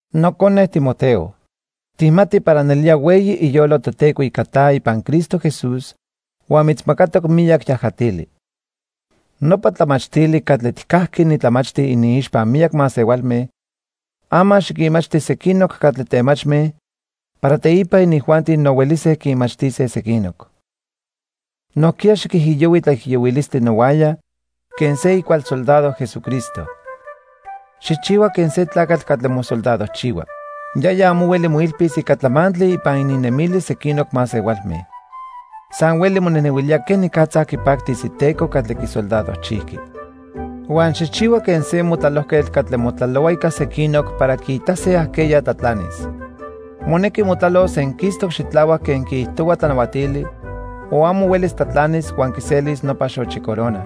Nocone Timoteo, tijmati para nelía hueyi iyolo Toteco ica ta ipan Cristo Jesús huan mitzmacatoc miyac yajatili. Nopa tlamachtili catli tijcajqui nitlamachti iniixpa miyac masehualme, ama xiquinmachti sequinoc catli temachme para teipa inijuanti no huelise quinmachtise sequinoc. Nojquiya xiquijiyohui tlaijiyohuilistli nohuaya quen se icual soldado Jesucristo. Xijchihua quen se tlacatl catli mosoldadojchihua. Yaya amo hueli moilpis ica tlamantli ipan ininnemilis sequinoc masehualme. San hueli monejnehuilía quenicatza quipactis iteco catli quisoldadojchijqui. Huan xijchihua quen se motlalojquetl catli motlalohua ica sequinoc para quiitase ajqueya tlatlanis. Monequi motlalos senquistoc xitlahuac quen quiijtohua tlanahuatili o amo huelis tlatlanis huan quiselis nopa xochi corona.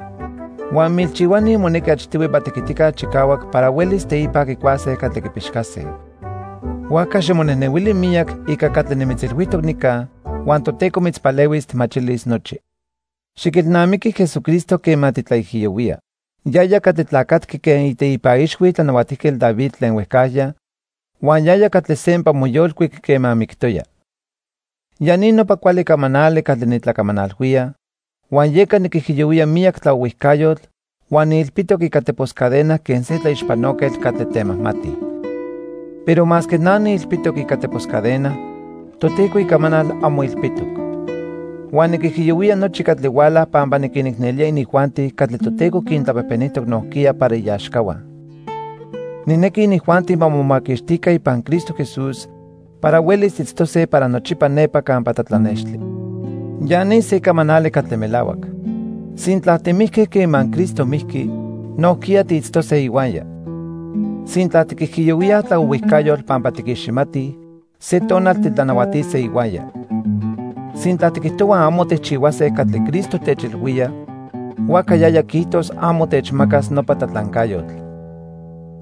Huan milchihuani monequi achtihui ma tequitica chicahuac para huelis teipa quicuase catli quipixcase. Huajca ximonejnehuili miyac ica catli nimitzilhuijtoc nica huan Toteco mitzpalehuis tijmachilis nochi. Xiquelnamiqui Jesucristo quema titlaijiyohuía. Yaya catli tlacatqui quen iteipan ixhui Tlanahuatijquetl David tlen huejcajya huan yaya catli sempa moyolcuic quema mictoya. Ya ni nopa cuali camanali catli nitlacamanalhuía, huan yeca niquijiyohuía miyac tlaohuijcayotl huan niilpitoc ica tepos cadena quen se tlaixpanoquetl catli temajmati. Pero masque na niilpitoc ica tepos cadena, Toteco icamanal amo ilpitoc. Huan niquijiyohuía nochi catli huala pampa niquinicnelía inijuanti catli Toteco quintlapejpenijtoc nojquiya para iaxcahua. Nijnequi inijuanti ma momaquixtica ipan Cristo Jesús para huelis itztose para nochipa nepa campa tlatlanextli. Ya ni se camanali catli melahuac: Sintla timijque quema Cristo mijqui, nojquiya tiitztose ihuaya. Sintla tiquijiyohuíaj tlaohuijcayotl pampa tiquiximatij, se tonal titlanahuatise ihuaya. Sintla tiquijtohuaj amo tijchihuase catli Cristo techilhuía, huajca yaya quiijtos amo techmacas nopa tlatlancayotl.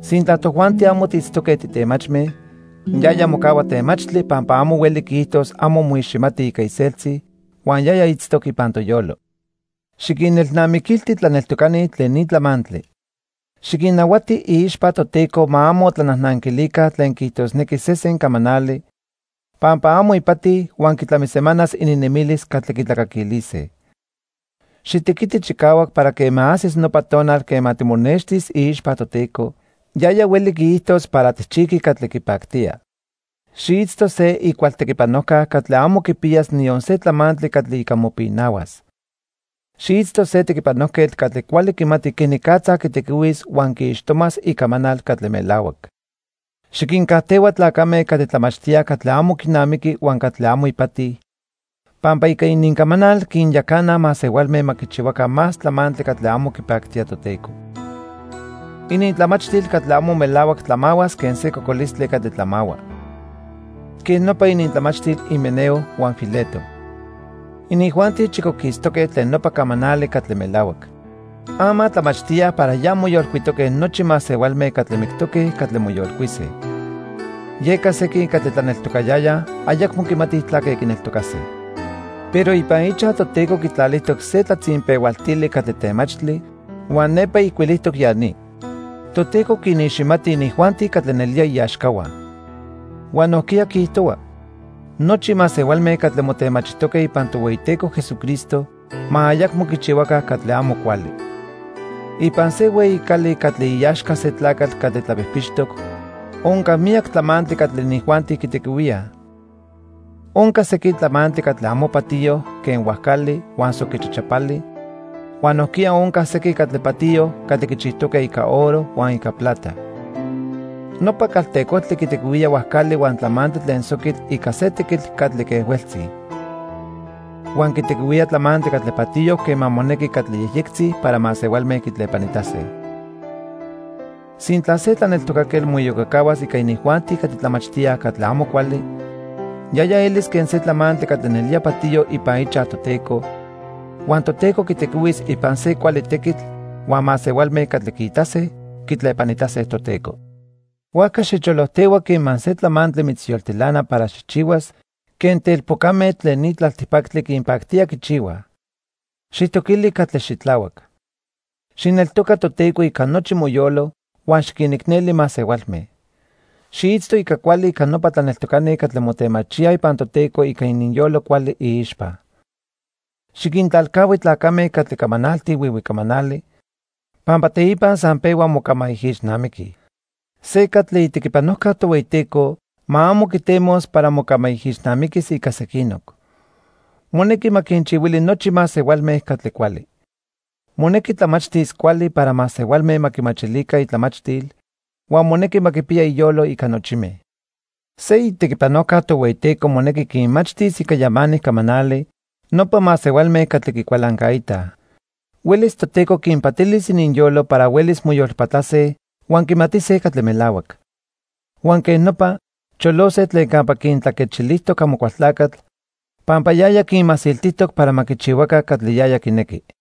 Sintla tojuanti amo tiitztoque titemachme, yaya mocahua temachtli pampa amo hueli quiijitos amo moiximati ica iseltzi huan yaya itztoc ipan toyolo. Xiquinelnamiquilti tlaneltocani tlen ni tlamantli. Xiquinnahuati iixpa Toteco ma amo tlanajnanquilica tlen quiijtosnequi sesen camanali, pampa amo ipati huan quitlamisemanas ininnemilis catli quitlacaquilise. Xitequiti chicahuac para quema ajsis nopa tonal quema timonextis iixpa Toteco, yaya hueli quiijtos para tijchijqui catli quipactía. Xiitzto se icual tequipanojca catli amo quipiyas niyon se tlamantli catli ica mopinahuas. Xiitzto se tequipanojquetl catli cuali quimati quenicatza quitequihuis huan quiixtomas Icamanal catli melahuac. Xiquincajtehua tlacame catli tlamachtíaj catli amo quinamiqui huan catli amo ipati, pampa ica inincamanal quinyacanaj masehualme ma quichihuaca más tlamantli catli amo quipactía Toteco. Inintlamachtil catli amo melahuac tlamahuas quen se cocolistli catli tlamahua. Quej nopa inintlamachtil Himeneo huan Fileto. Inijuanti chicoquistoque tlen nopa camanali catli melahuac. Ama tlamachtíaj para ya moyolcuitoque nochi masehualme catli mictoque catli moyolcuise. Yeca sequin catli tlaneltocayayaj ayacmo quimatij tlaque quineltocase. Pero ipan ichaj Toteco quitlalijtoc se tlatzinpehualtili catli temachtli huan nepa ijcuilijtoc ya ni: "Toteco quiniximati inijuanti catli nelía iaxcahua"; huan nojquiya quiijtohua: "Nochi masehualme catli motemachijtoque ipan Tohueyiteco Jesucristo ma ayacmo quichihuaca catli amo cuali." Ipan se hueyi cali catli iaxca se tlacatl catli tlapijpixtoc onca miyac tlamantli catli inijuanti quitequihuíaj. Onca sequin tlamantli catli amo patiyo quen huajcali huan soqui chachapali, huan nojquiya onca sequin catli patiyo catli quichijtoque ica oro huan ica plata. Nopa caltecojtli quitequihuía huajcali huan tlamantli tlen soquitl ica se tequitl catli quejhueltzi. Huan quitequihuía tlamantli catli patiyo quema monequi catli yejyectzi para masehualme quitlepanitase. Sintla se tlaneltocaquetl moiyocacahuas ica inijuanti catli tlamachtíaj catli amo cuali, yaya elis quen se tlamantli catli nelía patiyo ipan ichaj Toteco, huan Toteco quitequihuis ipan se cuali tequitl huan masehualme catli quiitase, quitlepanitase Toteco. Huajca xicholojtehua quema se tlamantli mitzyoltilana para xijchihuas quen telpocame tlen ni tlaltipactli quinpactía quichihuaj. Xijtoquili catli xitlahuac. Xijneltoca Toteco ica nochi moyolo, huan xiquinicneli masehualme. Xiitzto ica cuali ica nopa tlaneltocani catli motemachíaj ipan Toteco ica ininyolo cuali iixpa. Xiquintlalcahui tlacame catli camanaltij huihui camanali pampa teipa san pehuaj mocamaijixnamiquij. Se catli itequipanojca Tohueyiteco ma amo quitemos para mocamaijixnamiquis ica sequinoc. Monequi ma quinchihuili nochi masehualme catli cuali. Monequi tlamachtis cuali para masehualme ma quimachilica itlamachtil huan monequi ma quipiya iyolo ica nochime. Se itequipanojca Tohueyiteco monequi quinmachtis ica yamanic camanali nopa masehualme catli quicualancaitaj. Huelis Toteco quinpatilis ininyolo para huelis moyolpatlase huan quimatise catli melahuac. Huan quej nopa, cholose tlen campa quintlaquechilijtoc Amocualtlacatl, pampa yaya quinmasiltijtoc para ma quichihuaca catli yaya quinequi.